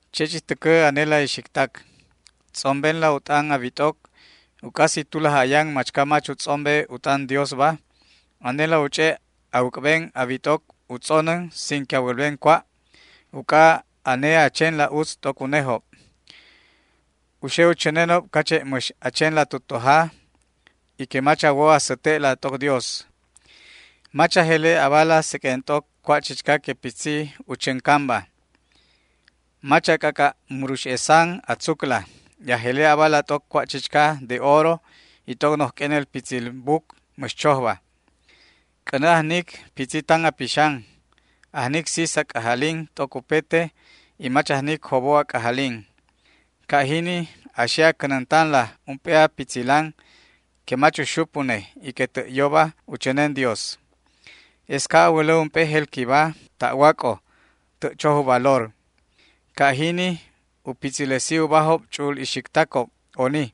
Che' chich täcä anela ixictac, tz'ombenla u t'an a wit'oc, uc'a si tulaj ayan machca mach u tz'ombe u t'an Diosba, anela u ch'e' a wäc'ben a wit'oc u tz'onän sin que a wälben cua', uc'a ane a chenla utz t'oc unejob. U xe u chänenob cache' mäx a chenla tu toja y que mach a wo a säte'la t'oc Dios. Mach a jele' abala seq'uen t'oc cua' chichca que pitzi u chäncanba. Mach a c'ac'a' murux'esan a tzucla y a jele' abala t'oc cua' chichca de oro y t'oc noj q'uenel pitzil buc mäx chojba. C'änä ajnic pitzi tan a pixan, ajnic sis a c'ajalin t'oc upete y mach ajnic jobo a c'ajalin. Ca' jini a xe a cänäntanla ump'e a pitzilan que mach uxup une y que tä' yoba u chänen Dios. Es ca' a wälä ump'e jelquiba ta'wac'o tä' choj u valor. Ca' jini u pitzilesi ubajob ch'u'ul ixictacob oni.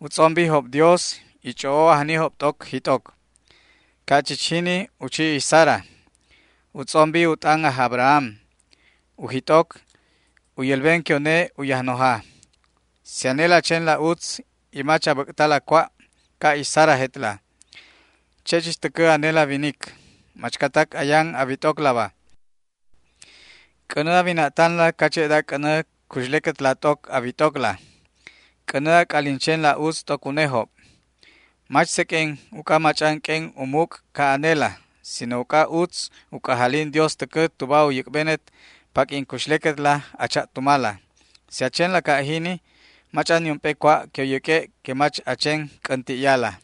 U tz'ombijob Dios y ch'o'o ajnijob t'oc jit'oc. Ca' chich jini u chi ix Sara. U tz'ombi u t'an aj Abraham, u jit'oc, u yälben que une u yajnoja. Si anela a chenla utz y mach a bäc'tala cua', ca' ix Sarajetla. Che' chich täcä anela winic, machcatac ayan a wit'oclaba, c'änä a wina'tanla cache'da c'änä cuxlequetla t'oc a wit'ocla. C'änä a c'alin chenla utz t'oc unejob, mach seq'uen uc'a mach'an q'uen u muc' ca' anela, sino uc'a utz u c'ajalin Dios täcä tuba u yäc'benet paq'uin cuxlequetla a cha'tumala. Si a chenla ca' jini mach'an niump'e cua' que u yäq'ue' que mach a chen c'änti'yala.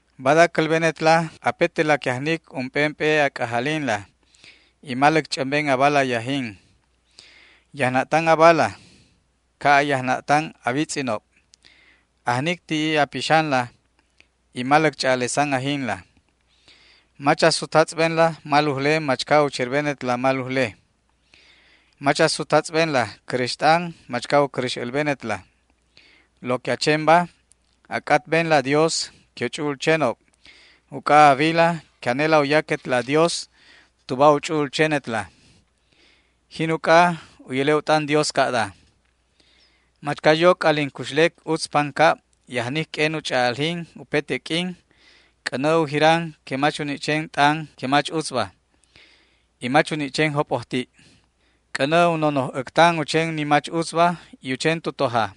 Bada cälbenetla apetela que ajnic ump'emp'e a c'ajalinla y maläc ch'ämben abala yajin. Yajna'tan abala ca' a yajna'tan a witz'inob. Ajnic ti'i a pixanla y maläc ch'a'alesan ajinla. Mach a sutatz'benla malujle machca u cherbenetla malujle. Mach a sutatz'benla cräxt'an machca u cäräx älbenetla. Lo que a chenba, a c'atbenla Dios que u ch'u'ul chenob, uc'a a wila que anela u yaquetla Dios tuba u ch'u'ul chenetla. Jin uc'a u yäle' u t'an Dios ca'da: Machca yo c'alin cuxlec utz pancab y ajnic q'uen u ch'a'aljin upete q'uin, c'änä u jiran que mach u ni' chen t'an que mach utzba y mach u ni' chen jop'ojti'. C'änä u nonoj äctan u chen ni mach utzba y u chen tu toja.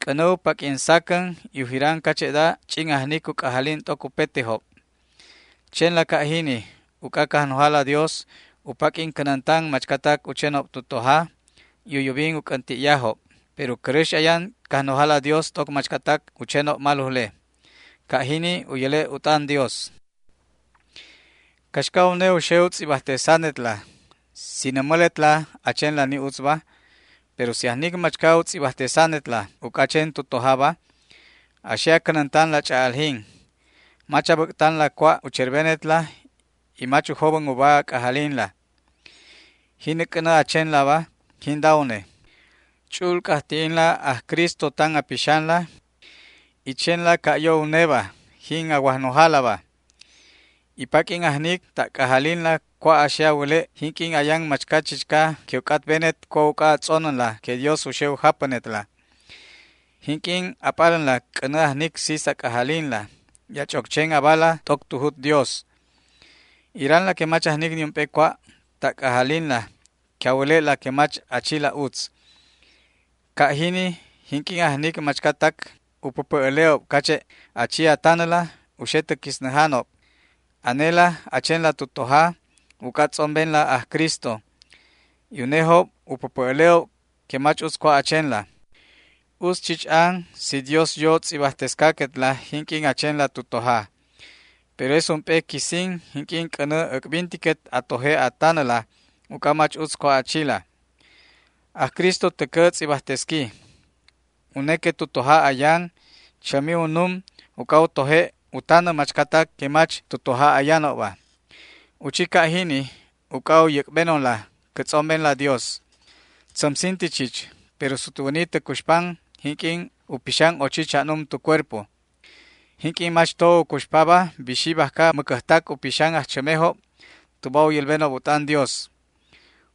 C'änä u paq'uin sacän y u jiran cache'da ch'in ajnic u c'ajalin t'oc upetejob. Chenla ca' jini uc'a Cajnojala Dios u paq'uin cänäntan machcatac u chenob tu toja y u yubin u c'änti'yajob, pero cäräx ayan Cajnojala Dios t'oc machcatac u chenob malujle. Ca' jini u yäle' u t'an Dios. ¿Caxca une u xe u tz'ibajtesanetla si nämäletla a chenla ni utzba? Pero si ajnic machca u tz'ibajtesanetla uc'a a chen tu tojaba, a xe a cänäntanla ch'a'aljin. Mach a bäc'tanla cua' u cherbenetla y mach u jobän uba a c'ajalinla. Jini c'änä a chenlaba jinda une: Ch'u'ul c'ajti'inla aj Cristo tan a pixanla y chenla ca' yo uneba, jin a Wajnojalaba. Y paq'uin ajnic ta' c'ajalinla cua' a xe a wäle' jinq'uin ayan machca chichca que u c'atbenet cua' uc'a a tz'onänla que Dios u xe u japänetla. Jinq'uin a p'alänla c'änä ajnic sis a c'ajalinla y a ch'oc chen abala t'oc tu jut Dios. Iranla que mach ajnic niump'e cua' ta' c'ajalinla que a wäle'la que mach a chila utz. Ca' jini, jinq'uin ajnic machcatac u päpä' äle'ob cache' a chi a tanäla u xe tä quisnäjanob. Anela a chenla tu toja uc'a a tz'ombenla aj Cristo, y unejob u päpä' äle'ob que mach utz cua' a chenla. Utz chich an si Dios yo tz'ibajtescaquetla jinq'uin a chenla tu toja. Pero es ump'e quisin jinq'uin c'änä äc'bintiquet a toje' a tanäla uc'a mach utz cua' a chila. Aj Cristo täcä tz'ibajtesqui. Une que tu toja ayan chämi unnum uc'a u toje' u tanä machcatac que mach tu toja ayanobba. U chi ca' jini uc'a u yäc'benonla cä tz'ombenla Dios. Tzämsinti chich, pero sutwäni tä cuxpan jinq'uin u pixan ochi cha'num tu cuerpo. Jinq'uin mach to u cuxpaba bixi bajca mäcäjtac u pixan ajchämejob tuba u yälbenob u t'an Dios.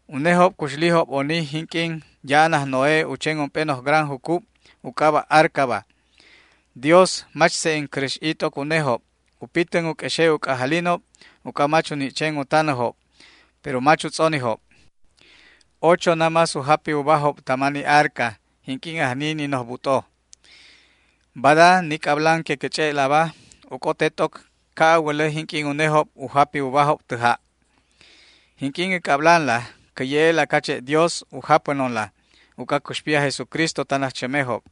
Unejob cuxlijob oni jinq'uin ya'an aj Noé u chen ump'e noj gran jucub u c'aba' arcaba. Dios mach se'en cäräx'i t'oc unejob u pitän u q'uexe' u c'ajalinob uc'a mach u ni' chen u tanäjob, pero mach u tz'onijob. Ochojob namás u japi ubajob tama ni arca jinq'uin ajni ni noj but'o. Bada ni c'ablan que cä ch'e'laba u c'ote t'oc ca' a wälä jinq'uin unejob u japi ubajob tä ja'. Jinq'uin cä c'ablanla cä ye'e'la cache' Dios u japänonla uc'a cuxpi aj Jesucristo tan ajchämejob.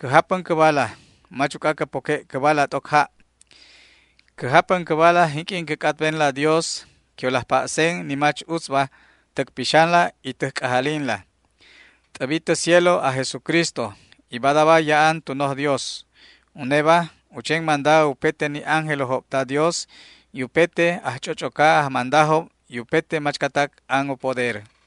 Cä japän cäbala, mach uc'a cä poque' cäbala t'oc ja'. Cä japän cäbala jinq'uin cä c'atbenla Dios que u laj pa'sen ni mach utzba täc pixanla y täj c'ajalinla. T'äbi tä cielo aj Jesucristo y badaba ya'an tu noj Dios. Uneba u chen manda upete ni ángelojob ta Dios y upete ajch'och'oca ajmandajob y upete machcatac an u poder.